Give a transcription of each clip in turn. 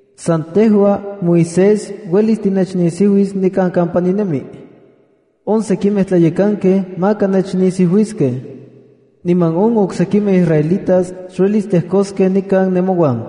San tejua, Moisés, uelis tinechnisiuis nikan kampa ninemi. On sekimej tlayekankej maka nechnisiuiskej, niman on oksekimej israelitas xuelis tlejkoskej nikan nemouan.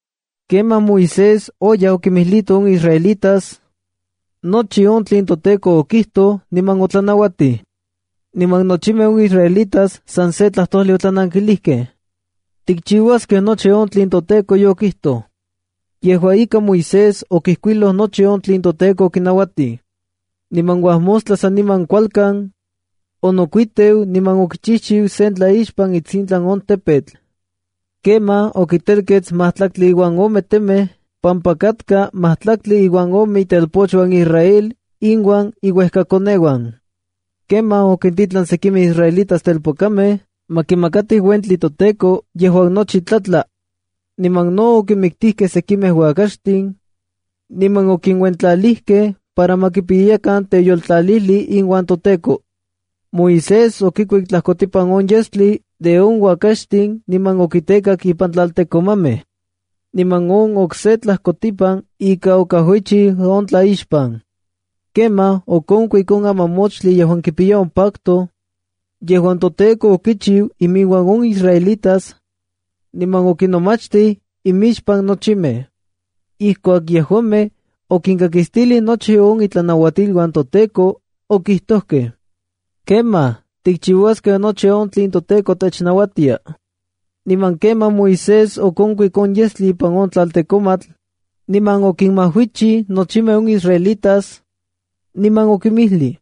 Kemaj Moisés oyaj okinmijlito on israelitas nochi on tlen toTEKO okijtoj niman otlanauatij. Niman nochimej on israelitas san se tlajtojli otlanankilijkej: —Tikchiuaskej nochi on tlen toTEKO yokijtoj. Yejua ika, Moisés okijkuiloj nochi on tlen toTEKO okinauatij. Niman uajmostla saniman kualkan, onokuiteu niman okichijchiu sen tlaixpan itsintlan on tepetl. Kemaj okitelketskej majtlaktli uan ome temej pampa katka majtlaktli uan ome itelpochuan Israel inuan inuekakoneuan. Kemaj okintitlan sekimej israelitas telpokamej ma kimakatij toTEKO uentli yejuan nochi tlatlak. Niman no okinmiktijkej sekimej uakaxtin niman okinuentlalijkej para ma kipiyakan teyoltlalijli iuan toTEKO. Moisés okikuik tlajkotipan on yestli de on uakaxtin niman okitekak ipan tlaltekomamej, niman on okse tlajkotipan ika okajuichij on tlaixpan. Kemaj okonkuik on amamoxtli yejuan kipiya on pacto yejuan toTEKO okichiu inmiuan on israelitas, niman okinomachtij imixpan nochimej. Ijkuak yejuamej okinkakistilij nochi on itlanauatiluan toTEKO, okijtojkej: —Kemaj, tikchiuaskej nochi on tlen toTEKO technauatia. Niman kemaj Moisés okonkuik on yestli ipan on tlaltekomatl, niman okinmajuichij nochimej on israelitas, niman okinmijlij: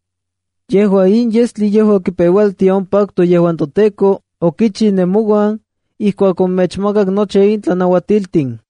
—Yejua in yestli yejua kipeualtia on pacto yejuan toTEKO okichiu nemouan ijkuak omechmakak nochi in tlanauatiltin.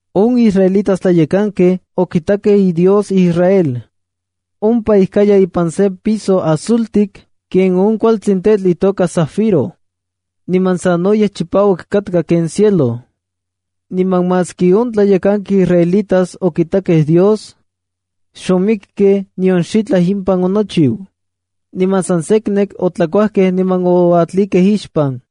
On israelitas tlayekankej okitakej iDios Israel. Ompa ijkaya ipan sen piso azultik ken on kualtsin tetl yejuan itoka zafiro, niman sanoyej chipauak katka ken cielo. Niman maski on tlayekankej israelitas okitakej Dios, xomikkej nion xitlaj impan onochiu. Niman san seknek otlakuajkej niman oatlikej ixpan.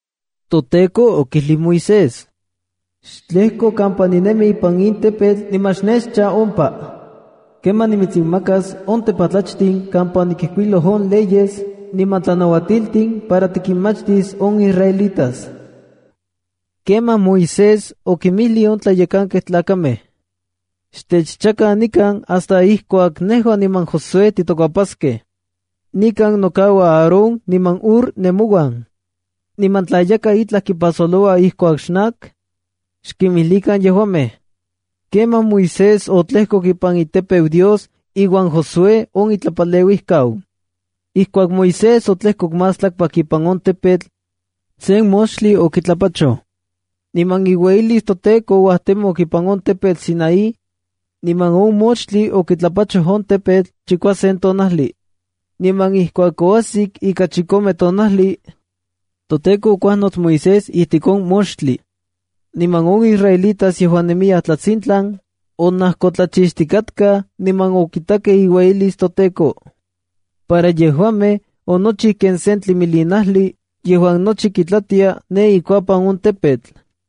ToTEKO okijlij Moisés: —Xtlejko kampa ninemi ipan in tepetl niman xnechcha ompa. Kemaj nimitsinmakas on tepatlachtin kampa onikijkuiloj on leyes niman tlanauatiltin para tikinmachtis on israelitas. Kemaj Moisés okinmijlij on tlayekankej tlakamej: —Xtechchakan nikan hasta ijkuak nejua niman Josué titokuepaskej. Nikan nokauaj Aarón niman Hur nemouan, niman tla yakaj itlaj kipasoloua ijkuak xnak, xkimijlikan yejuamej. Kemaj Moisés otlejkok ipan itepeu Dios iuan Josué on itlapaleuijkau. Ijkuak Moisés otlejkok más tlakpak ipan on tepetl, sen moxtli okitlapachoj. Niman iueyilis toTEKO ouajtemok ipan on tepetl Sinaí, niman on moxtli okitlapachoj on tepetl chikuasen tonajli. Niman ijkuak oajsik ika chikome tonajli, toTEKO okuajnots Moisés ijtik on moxtli. Niman on israelitas yejuan nemiyaj tlatsintlan onajkotlachixtikatkaj niman okitakej iueyilis toTEKO. Para yejuamej, onochiu ken sen tlimilinajli yejuan nochi kitlatia ne ikuapan on tepetl.